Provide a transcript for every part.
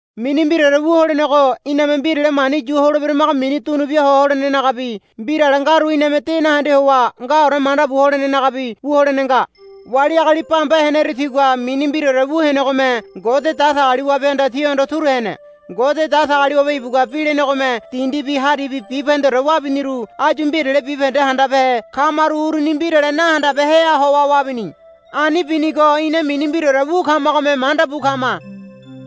Mini mbiraore wu holenego iname mbirale mani yu holeberamago mini dunu bia ho holenenagabi mbirale ngaru iname de nahende howa ngaore manda bu holenenagabi wu holene nga. Wali agali bamba heneru tigua mini mbiraore wu henegome Ngode Datagaliwabehanda tihondo turu hene. Ngode Datagaliwabe ibugua bi lenegome dindibi haribi bibahendeore wabiniru áyu mbirale bibahende handabehe kamaru uruni mbirale nahandabeheha howa wabini. Ani binigo ina mini mbiraore wu kamagome manda bu kama.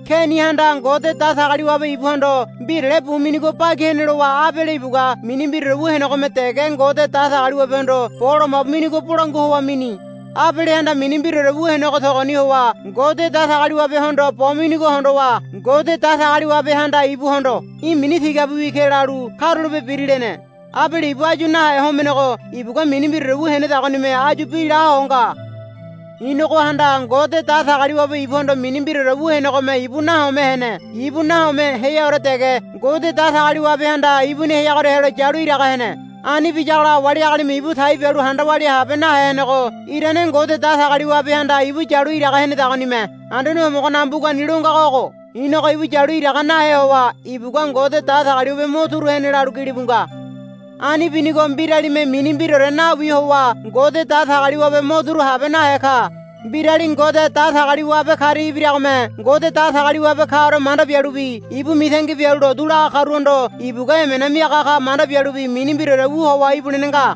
Kenihanda Ngode Datagaliwabe ibuhondo mbirale bu minigo bagi hene lowa Abele ibugua mini mbiraore wu henegome dege Ngode Datagaliwabehondo bo lomabu minigo bolangua howa mini. Abelehanda mini mbiraore wu henego togoni howa Ngode Datagaliwabehondo bo minigo hondowa Ngode Datagaliwabehanda ibuhondo, Í̠ mini tigabiwi ke, lalu, Karulape biri, lene. Abele ibu áyu nahe homenego ibugua mini mbiraore wu henedagonime áyu bi la ho nga. Inogohanda Ngode Datagaliwabe ibuhondo mini mbiraore wu henegome ibu nahome hene. Ibu nahome heaore dege Ngode Datagaliwabehanda ibuni heagoria helo yalu iraga hene. Ani biyagola wali agalime ibu tai bialu handa walia habe nahe henego irane Ngode Datagaliwabehanda ibu yalu iraga henedagonime. Anduane Homogonaga mbugani lo ngago ogo, Inogo ibu yalu iraga nahe howa ibugua Ngode Datagaliwabe mo turu hene, lalu gilibu nga. Ani binigo mbiralime mini mbiraore nawi howa Ngode Datagaliwabe mo turu habe nahe ka. Mbirali Ngode Datagaliwabe karia ibiragome Ngode Datagaliwabe kaore manda bialubi ibu mitangi bialu lotu laga karuhondo ibugua emena miaga ka manda bialubi mini mbiraore wu howa ibulene nga.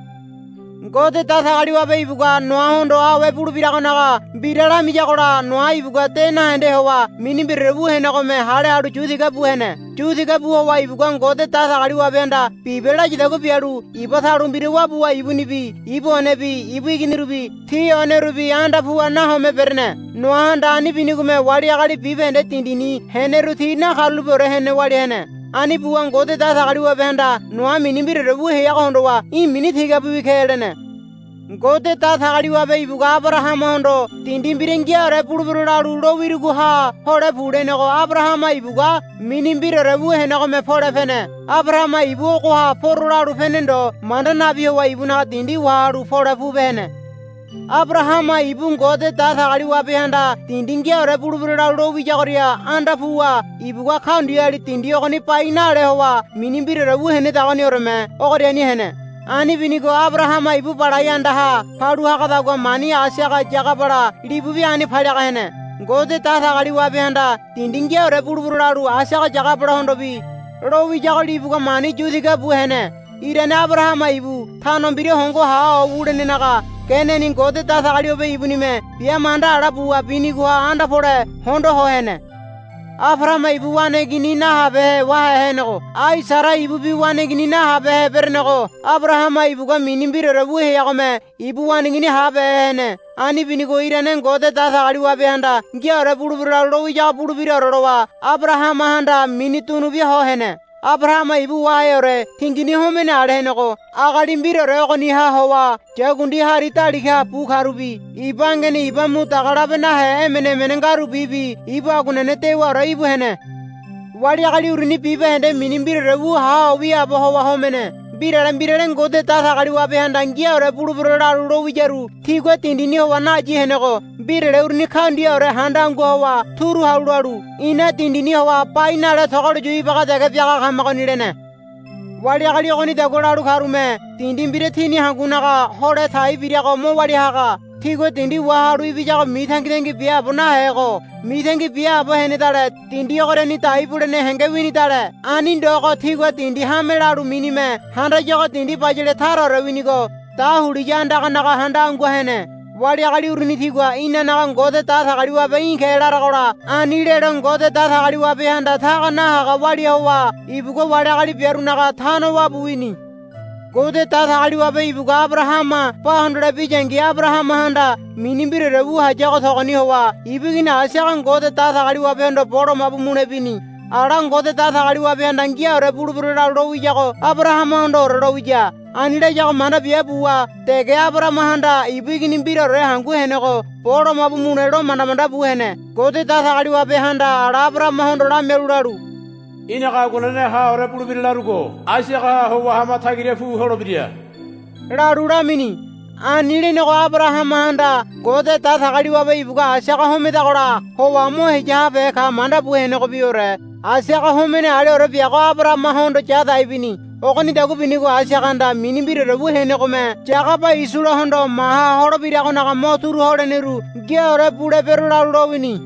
Ngode Datagaliwabe ibugua Noahondo awe bulebiragonaga mbira lamiyagola Noa ibugua de nahende howa mini mbiraore wu henegome hale halu yu tiga bu hene. Yu tiga bu howa ibugua Ngode Datagaliwabehanda, Bibe, layadagua bialu iba talu mbira wabuwa ibunibi ibu onebi ibu iginirubi ti onerubi anda puwa nahome berene. Noahanda ani binigome wali agali bibahende dindini heneru ti nakarulapeore hene walia hene. Ani buwa Ngode Datagaliwabehanda Noa mini mbiraore wu heago hondowa, Í̠ mini tigabiwi ke, lene. Ngode Datagaliwabe ibugua Abarahamahondo, Dindi mbira ngiaore bulebero lalu lowirugoha hole pu, lenego Abarahama ibugua mini mbiraore wu henegome pole pene. Abarahama ibu, Ogoha poro, lalu pene ndo manda nabi howa ibunaga dindi wahalu pole pupe hene. Abarahama ibu Ngode Datagaliwabehanda, Dindi ngiaore bulebero, lalu lo wiyagoria anda puwa ibugua kaundiali dindi ogoni bai nale howa mini mbiraore wu henedagonioreme ogoriani hene. Ani binigo Abarahama ibu balai andaha palu hagadagua mani Aisaga Yagabala libubi ani paliaga hene. Ngode Datagaliwabehanda, Dindi ngiaore bulebero, lalu Aisaga Yagabalahondobi lowiyago libugua mani yu tiga bu hene. Irane Abarahama ibu tano mbira hongo ha ho wulenenaga geneni Ngode Datagaliwabe ibunime bia manda ala buwa binigoha anda pole hondo ho hene. Abarahama ibu waneigini nahabehe wahe henego ai Sara ibubi waneigini nahabehe berenego Abarahama ibugua mini mbiraore wu heagome ibu waneigini habehe hene. Ani binigo irane Ngode Datagaliwabehanda, Ngiaore bulebero, lalu lowiyago bulebiraore lowa Abarahamahanda mini dunubia ho hene. Abarahama ibu waheore tingini homene ale henego agali mbiraore ogoniha howa yakundi hari daligaha bu karubi iba angeni iba mu daga labe nahe emene emene ngarubibi ibu aguanene dewaore íbu hene. Wali agali uruni bibahende mini mbiraore wu ha ho wiaabo howa homene. Mbirale mbirale Ngode Datagaliwabehanda, Ngiaore bulebero, lalu lowiyaru tigua dindini howa nayi henego mbirale uruni kaundiaore handa angua howa turu halu lalu, I̱na dindini howa bai nale togolo yu ibaga dege biaga kamagoni, lene. Wali agali ogonidagua lalu karume dindi mbira tini hangunaga hole tai birago mo walia haga. Tigua dindi wahalu ibiyago mitangitangi biaabo nahego mitangi biaabo henedale dindi ogoriani dai bulene henge winidale. Ani ndogo tigua dindi hame lalu minime handayago dindi bayale taraore winigo dahuliya andaganaga handa angua hene. Wali agali uruni tigua, Inanaga Ngode Datagaliwabe í̠ ke, laragola ani lelo Ngode Datagaliwabehanda taga nahaga walia howa ibugua wali agali biarunaga tano wabu wini. Ngode Datagaliwabe ibugua Abarahama ba hondole biyangi Abarahamahanda mini mbiraore wu hayago togoni howa ibu igini Aisaga Ngode Datagaliwabehondo bo lomabu mule bini. Ala Ngode Datagaliwabehanda, Ngiaore bulebero, lalu lowiyago Abarahamahondoore lowiya. Ani layago manda bia buwa dege Abarahamahanda ibu igini mbiraore hangu henego bo lomabu mule lo manda manda bu hene. Ngode Datagaliwabehanda ala Abarahamahondo lamialu lalu, Í̠naga aguanene haore bulebira larugo Aisagaha howa hama tagira pu holebira, lalu lamini. Ani lenego Abarahamahanda, Ngode Datagaliwabe ibugua Aisaga homedagola howa mo heya habehe ka, manda bu henegobiore Aisaga homene aleore biago Abarahamahondo ya dai bini. Ogonidagua binigo Aisagahanda mini mbiraore wu henegome Yagaba Isolahondo maha holebiragonaga mo turu holeneru, Ngiaore bulebero, lalu lowini.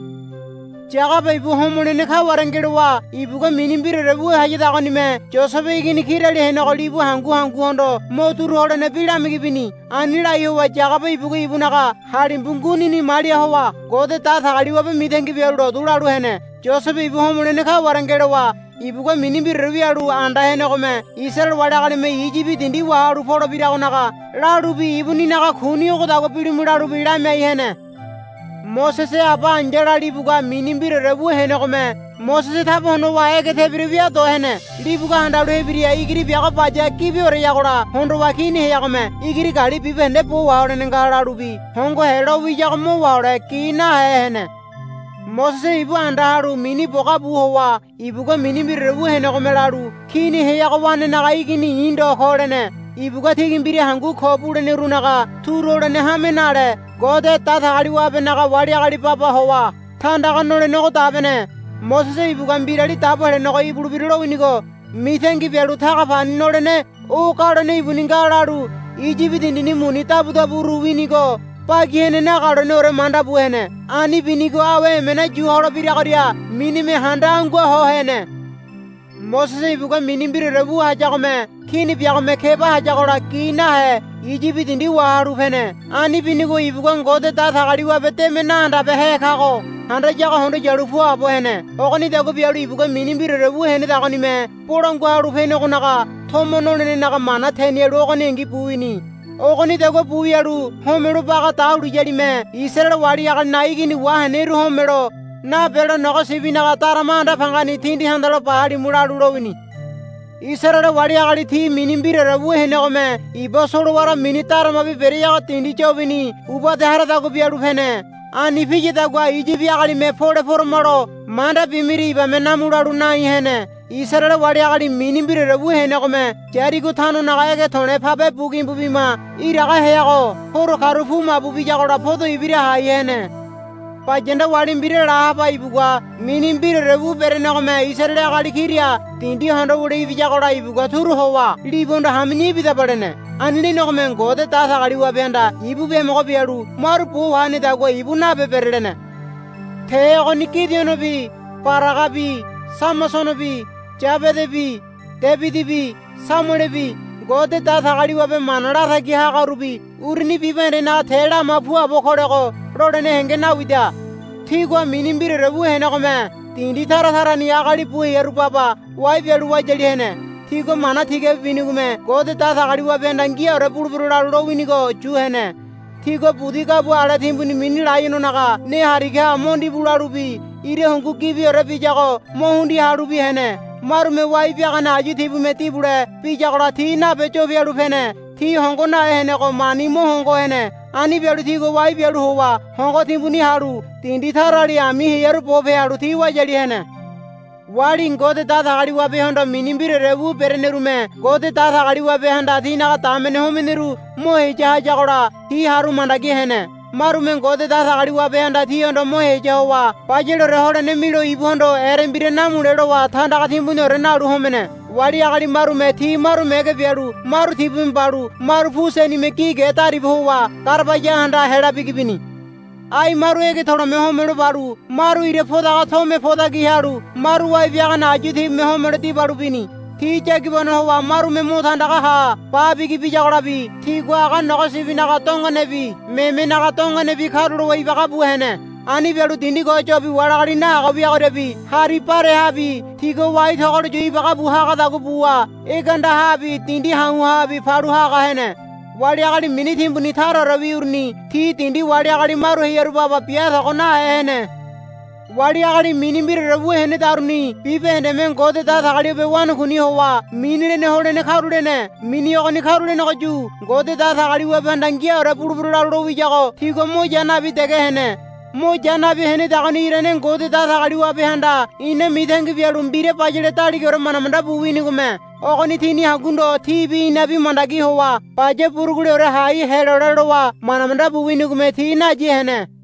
Yagaba ibu homolene kaware ngelowa ibugua mini mbiraore wu hayadagonime Yosebe igini kirali henego libu hangu hanguhondo mo turu holene bi lamigi bini. Ani lai howa Yagaba ibugua ibunaga halimbu ngunini malia howa Ngode Datagaliwabe mitangi bialu lotu lalu hene. Yosebe ibu homolene kaware ngelowa ibugua mini mbiraore wialu anda henegome Isaraele wali agalime Iyibi dindi wahalu polebiragonaga lalubi ibuninaga kuni ogodagua bilimu lalubi lamiai hene. Mosese aba ai̱yala libugua mini mbiraore wu henegome Mosese taba honowa ege tebira wia do hene. Libugua handalu hebira igiri biago baya gibioreyagola hondowa kini heagome, Igiri gali bibahende bo waholene nga, lalu bi hongohe lowiyago mo wahole gi nahe hene. Mosese ibu anda halu mini boga bu howa ibugua mini mbiraore wu henegome lalu, Kini heago wanenaga igini i̱ ndo ko, lene. Ibugua tigi mbira hangu ko bulenerunaga turu holene hame nale Ngode Datagaliwabenaga wali agali baba howa tandaga nolenego dabene. Mosese ibugua Mbirali Dabo Helenego ibulebira lowinigo mitangi bialu taga pani nolene o galone ibuni nga lalu Iyibi dindini muni dabudaburu winigo bagi hene nagaloneore manda bu hene. Ani binigo awe emena yu holebiragoria minime handa anguaho hene. Mosese ibugua mini mbiraore wu hayagome kini biagome keba hayagola gi nahe Iyibi dindi wahalu pene. Ani binigo ibugua Ngode Datagaliwabe deme nahandabehe kago handayago hondo yalu puabo hene. Ogonidagua bialu ibugua mini mbiraore wu henedagonime Bolangua Halu Penegonaga tomo nolenenaga mana tenialu ogoningi bu wini. Ogonidagua bu wialu Homelo Baga Dahuliyalime Isaraele wali agalinaga igini waheneru homelo nabelo, Nogo sibinaga darama anda pangani tindi tandalo ba halimu, lalu lowini. Isaraele wali agali ti mini mbiraore wu henegome iba solowara mini Daramabi bereago dindi yobini ubade haradagua bialu pene. Ani piyadagua Iyibi agalime pole poramalo manda bimiria ibame namu lalu nai hene. Isaraele wali agali mini mbiraore wu henegome Yarigo tanonaga ege to̱le̱ pabe bu gimbu bima iraga heago horo karu pu mabu biyagola podo ibira hai hene. Bayanda wali mbira Lahaba ibugua mini mbiraore wu berenegome Isaraele agali kira dindi hondo wule ibiyagola ibugua turu howa libuhondo, Hami̱ya ibidaba, lene. Ani lenegome Ngode Datagaliwabehanda ibu biamogo bialu maru bo wahenedagua ibu nabe berelene. Te ogoni Gidionobi Baragabi Samasonobi Yabedabi Debidibi Samuelebi Ngode Datagaliwabe mana latagi hagarubi uruni bibahendenaga te lama puabo kolego lolene henge nawida. Tigua mini mbiraore wu henegome dindi tara tarani agali bu hearu baba wai bialu wayali hene. Tigua mana tigabi binigome Ngode Datagaliwabehanda, Ngiaore bulebero, lalu lowinigo yu hene. Tigua budi gabua ale timbuni mini laiononaga ne hariga mo ndibu lalubi ira hungu gibiore biyago mo hundia halubi hene. Marume wai biagane ayu tibume dibule biyagola ti nabe yo pialu pene. Ti hongo nahe henego mani mo hongo hene. Ani bialu tigua wai bialu howa hongo timbuni halu dindi tarali ami hearu bope halu ti wayali hene. Wali Ngode Datagaliwabehondo mini mbiraore wu berenerume Ngode Datagaliwabehanda tinaga damene homeneru mo heya hayagola ti haru mandagi hene. Marume Ngode Datagaliwabehanda tihondo mo heya howa bayaleore holene milo ibuhondo erembira namule lowa tandaga timbuniore nalu homene. Wali agali marume ti maru mege bialu maru tibume balu maru pu senime gi ge dariba howa garabaya andaha hela bigi bini. Ai maru ege to̱le̱me homelo balu maru ira podaga tome podaki halu maru wai biagane ayu tibume homelo dibalu bini. Ti yagibano howa marume mo tandaga ha ba bigi biyagolabi tigua aga nogo sibinaga dongonebi memenaga dongonebi karulowa ibaga bu hene. Ani bialu dindi ko yobi wali agali nahaga wiagoriabi hari barehabi tigua wai togolo yu ibaga bu hagadagua buwa ege andahabi dindi ha̱u̱habi palu haga hene. Wali agali mini timbuni taraorewi uruni ti dindi wali agali maru hearu baba bia tago nahe hene. Wali agali mini mbiraore wu henedaruni bibahendeme Ngode Datagaliwabe wanakuini howa mini lene holene karulene. Mini ogoni karulenegoyu Ngode Datagaliwabehanda, Ngiaore bulebero, lalu lowiyago tigua mo ya nabi dege hene. Mo ya nabi henedagoni irane Ngode Datagaliwabehanda ina mitangi bialu mbira bayale daligaore manda manda bu winigome. Ogoni tini hangu ndo tibi inabi mandagi howa baya buruguleore hai helole lowa manda manda bu winigome ti nayi hene.